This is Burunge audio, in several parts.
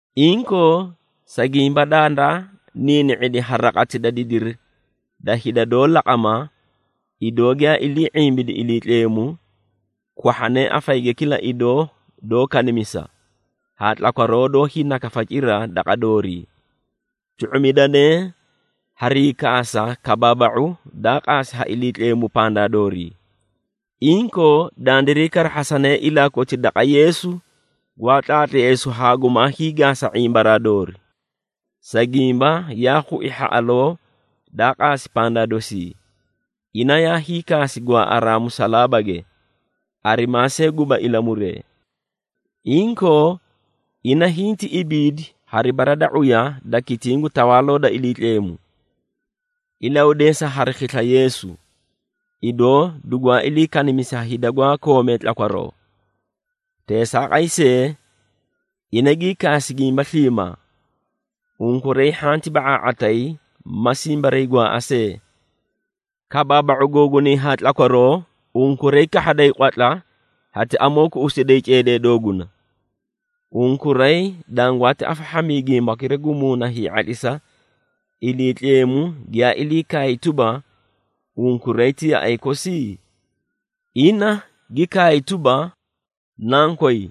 Inkoo, sa gimba dandaa niini⁄idi ha raqati da didiri da hida doó laqama, idoo giyaa ilii ⁄imbidi Iliitleemu, kwahhanee afayige kila idoo doó kanimisa, haa tlakwaroo doó hiinakafa cira daqa doorii. Tu⁄umidanee hari hiikaasa kabaaba⁄u daa qaasi ha Iliitleemu pandaa doorii. Inkoo, dandiray karahhasanee ilaa koti daqa Yeesu gwaa tlaatleesu haa gumaa hiigaasa ⁄imbaraa doori. Sa gimba yaa khui hhaꞌaloo daa qaasi pandaa dosii, ina yaa hiikaasi gwaaꞌaraa musalaabage, arimaa see guba ilamuree. Inkoo, ina hinti ibiidi hari bara da ⁄uya da kitiĩ gu Tawaaloo da Iliitleemu. Ilahudeesa hari khisla Yeesu, idoo dugwaa ilii kanimisi ha hida gwaa koomee tlakwaroo. Teesaaqay see, ina gii kaasi gimba sliimaa. Unkuray hhanti ba⁄aa⁄atayi ma simbariigwaaꞌa see. Kabaaba⁄u googunay haa tlakwaroo, unkuray kahhaday qwatla hati amoo kuꞌusiday ceedee dooguna. Unkuray dangwaati afahhamii gimbakira gu muuna hii⁄atlisa, Iliitleemu giyaa ilii kaay tuba, unkuray ti yaꞌay kosi? Ina gi kaay tuba, “Nankoy,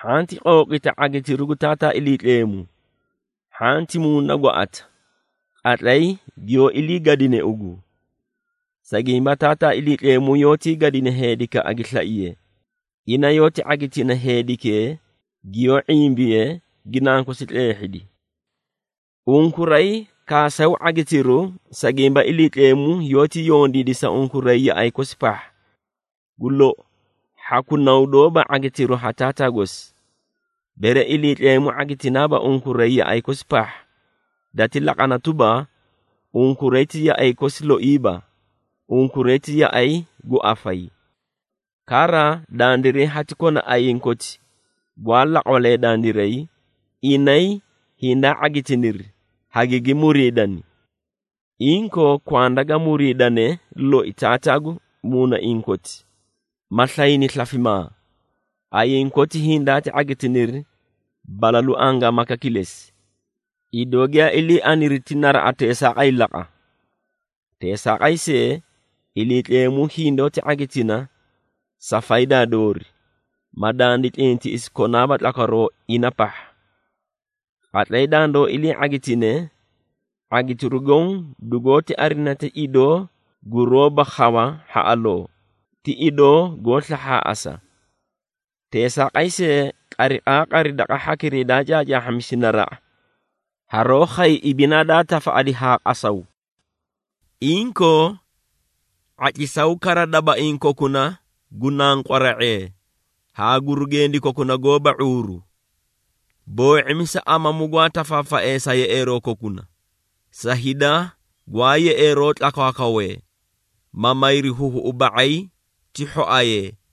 hhanti qooqita ⁄agitiru gu Taataa Iliitleemu, hhanti muuna gwaaꞌata, qatlay giyoó iliigadine ugu. Sa gimba Taataa Iliitleemu yoótii gadina heedikaꞌa gi slaiye, ina yoóti ⁄agitina heedikee giyoó ⁄imbiye gi nankosi tleehhidi.” Unkuray kaasaw ⁄agitiru, sa gimba Iliitleemu yoóti yondiidi sa unkuray yaꞌay kosi pahha. Gu lou, hhaku naw doóba ⁄agitiru ha taataa gosi. Bere Iliitleemu ⁄agitinaaba unkuray yaꞌay kosi pahha, dati laqana tuba, unkuray ti yaꞌay kosi loiiba, unkuray ti yaꞌay gu afayi. Kara, dandiray hati kona ayiĩ koti gwaa laqwalee dandiray, inay hindaa ⁄agitiniri, hagigi muriidani. Inkoo, kwanda ga muriidane loi Taataa gu muunaiĩ koti, ma slayni slafimaa. Ayiĩ koti hindaati ⁄agitiniri balalu angaamaka kilesi, idoo giyaa ilii aniri ti naraꞌa teesaaqay laqa. Teesaaqay see, Iliitleemu hindoóti ⁄agitina sa faydaa doori, ma dandi tlintiꞌisi konaaba tlakwaroo ina pahha. Qatlay dandoó ilii ⁄agitine, ⁄agitiru goõ dugoóti arina ti idoo guroóba khawa hhaꞌaloo, ti idoo goó slahhaaꞌasa. Teesaaqay see, qariqaaqari daqa hhakiray daa caacaahhamisi naraꞌa, haroó khay ibinaa daa tafaꞌadi haa qasaw. Inkoo, ⁄atlisaw kara dabaiĩ kokuna gu nanqwaree⁄ee haa gurugendi kokuna goóba ⁄uuru. Boo⁄imisa amamu gwaa tafaafaee sa yeꞌeeroo kokuna sa hida gwaa yeꞌeeroo tlakwaakwawee, ma mayri huhuꞌu ba⁄ay ti hhoayee.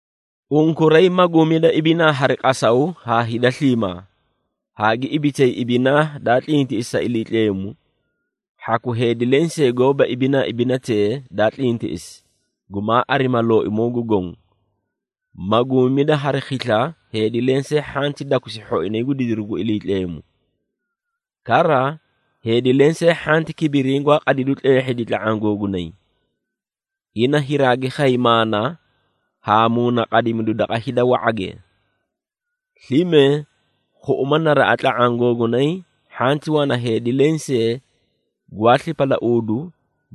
Unkuray maguumida ibinaa hari qasaw haa hida sliimaa, haa gi ibitay ibinaa daa tlintiꞌisi sa Iliitleemu. Hhaku heedi lensee goóba ibinaa ibinatee daa tlintiꞌisi, gumaa arima Looimoo gu Goõ. Maguumida hari khisla heedi lensee hhanti dakusi hhoinay gu didiru gu Iliitleemu. Kara, heedi lensee hhanti kibiriĩ gwaa qadaw tleehhidi tla⁄aã googunay. Ina hiraagi khay maana haa muunaqadimidu daqa hida wa⁄age. Slime khuꞌuma naraꞌa tla⁄aã googunay hhanti wana heedi lensee gwaa slipalauudu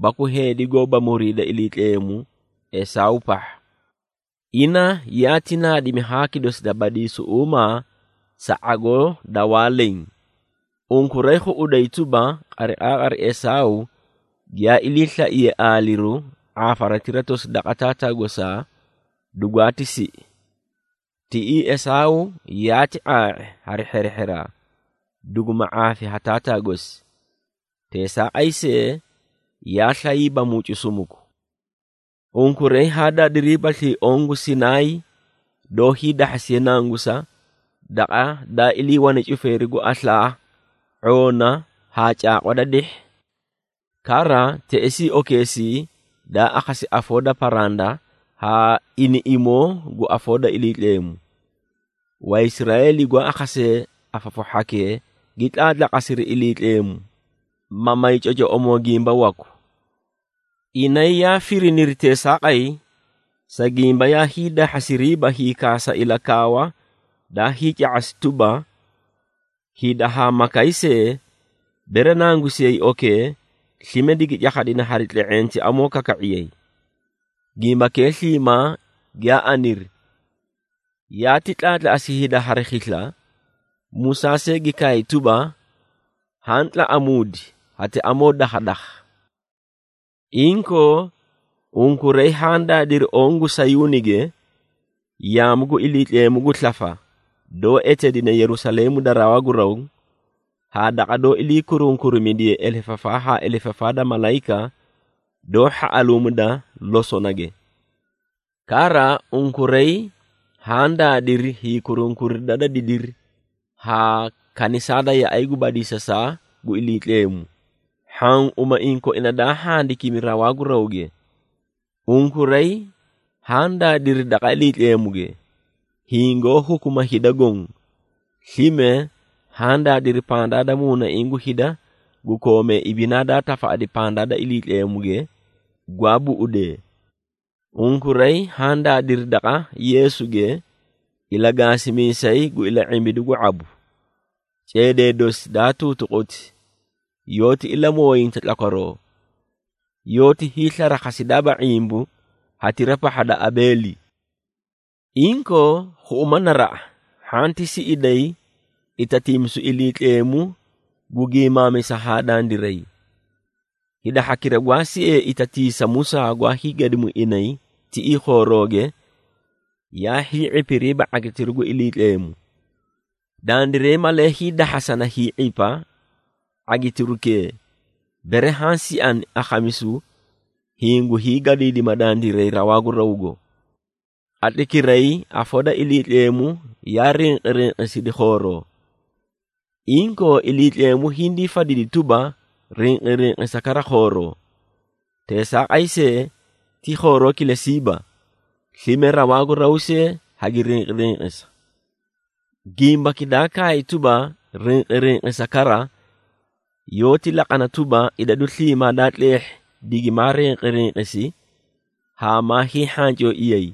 baku heedi goóba muriida Iliitleemu Esaaw pahha. Ina yaati naadimi haaki dosi da badiisuꞌuumaa sa ⁄agoo da waa leẽ. Unkuray khuꞌuday tuba, qariqaaqari Esaaw giyaa iliislaiye aaliru ⁄aafaratira tosi daqa taataa gosaa, dugwaati siꞌi. Tiꞌii Esaaw yaati ⁄aa⁄i hari hherehheraa, duguma ⁄aafi ha taataa gosi. Teesaaqay see, yaa slayiiba mucu sumuku. Unkuray haa daadiriibaslii oõ gu Sinaay doó hiidahhasiye nangusa, daqa daa iliiwane cufeeri gu aslaa, ⁄oona haa caaqwa da dihhi. Kara, teꞌesii okeesii daa akhasi afoo da paranda haa iniꞌimoo gu afoo da Iliitleemu. Waisraeeli gwaa akhasee afafu hhakee gi tlaatlaqasiri Iliitleemu, ma may cocoꞌomoo gimba waku. Inay yaa firiniri teesaaqay, sa gimba yaa hiidahhasiriiba hiikaasa ilakaawa daa hiica⁄asi tuba, “Hida haa makay see, bere nangusiyay okee, slime, digi cakhadina hari tle⁄eẽ ti amoo kaka⁄iyay.” Gimbakee sliimaa giyaa aniri, yaati tlaatlaꞌasi hida hari khisla, Musaa see gi kaay tuba, “Haã tlaꞌamuudi hati amoo dakhadakha.” Inkoo, unkuray haã daadiri oõ gu Sayuunige, yaamu gu Iliitleemu gu slafa, doó eteedine Yerusaleemu da rawaa gu raw haa daqa doó ilii kurunkurimidiye elefafaa haa elefafaa da malayika doó hhaꞌaluumida losonage. Kara, unkuray haã daadiri hiikurunkurida da didiri haa kanisaa da yaꞌay gu badiisasaa gu Iliitleemu, hhaã umaiĩ koina daa handikimi rawaa gu rawge. Unkuray haã daadiri daqa Iliitleemuge, hiĩ goó hukuma hida goõ. Slime, haã daadiri pandaa da muunaiĩ gu hida gu koomee ibinaa daa tafaꞌadi pandaa da Iliitleemuge, gwaa buꞌudee. Unkuray haã daadiri daqa Yeesuge, ilagaasimiisay gu ila⁄imbidu gu ⁄abu. Ceedee dosi daa tuutuquti yoóti ilamooyinta tlakwaroo, yoóti hiislarakhasidaaba ⁄imbu hatira pahha da Abeeli. Inkoo, khuꞌuma naraꞌa hhanti siꞌiday itatiimisu Iliitleemu gu gimaamisa haa dandiray. Hida hhakira gwaa siee itatiisa Musaa gwaa hiigadimu inay tiꞌii khoorooge yaa hii⁄ipiriiba ⁄agitiru gu Iliitleemu. Dandiray malee hiidahhasana hii⁄ipa ⁄agitirukee, bere haã siani akhamisu hiĩ gu hiigadiidima dandiray rawaa gu rawgo. Qatlaykiray afoo da Iliitleemu yaa rinqirinqisidi khooroo. Inkoo, Iliitleemu hindii fadidi tuba, “Rinqirinqisa kara khooroo. Teesaaqay see, ti khooroo kilesiiba, slime rawaa gu raw see hagi rinqirinqisa.” Gimbaki daa kaay tuba, “Rinqirinqisa kara,” yoóti laqana tuba, idadu sliimaa daa tleehhi digimaa rinqirinqisi haa maa hiihhancooiyay,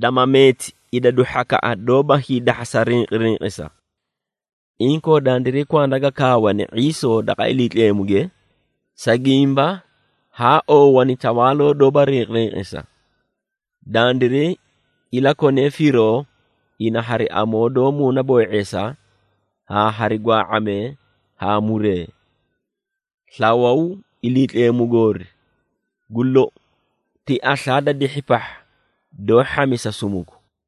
dama meeti idadu hhakaꞌa doóba hiidahhasa rinqirinqisa. Inkoo, dandiray kwanda ga kaawane ⁄iisoo daqa Iliitleemuge, sa gimba haa oowani tawaaloo doóba rinqirinqisa. Dandiray ilakonee firoo ina hari amoo doó muunaboo⁄eesa, haa hari gwaa⁄amee haa muree. Slawaw, Iliitleemu goori, gu lou ti aslaa da dihhi pahha doó hhamisa sumuku.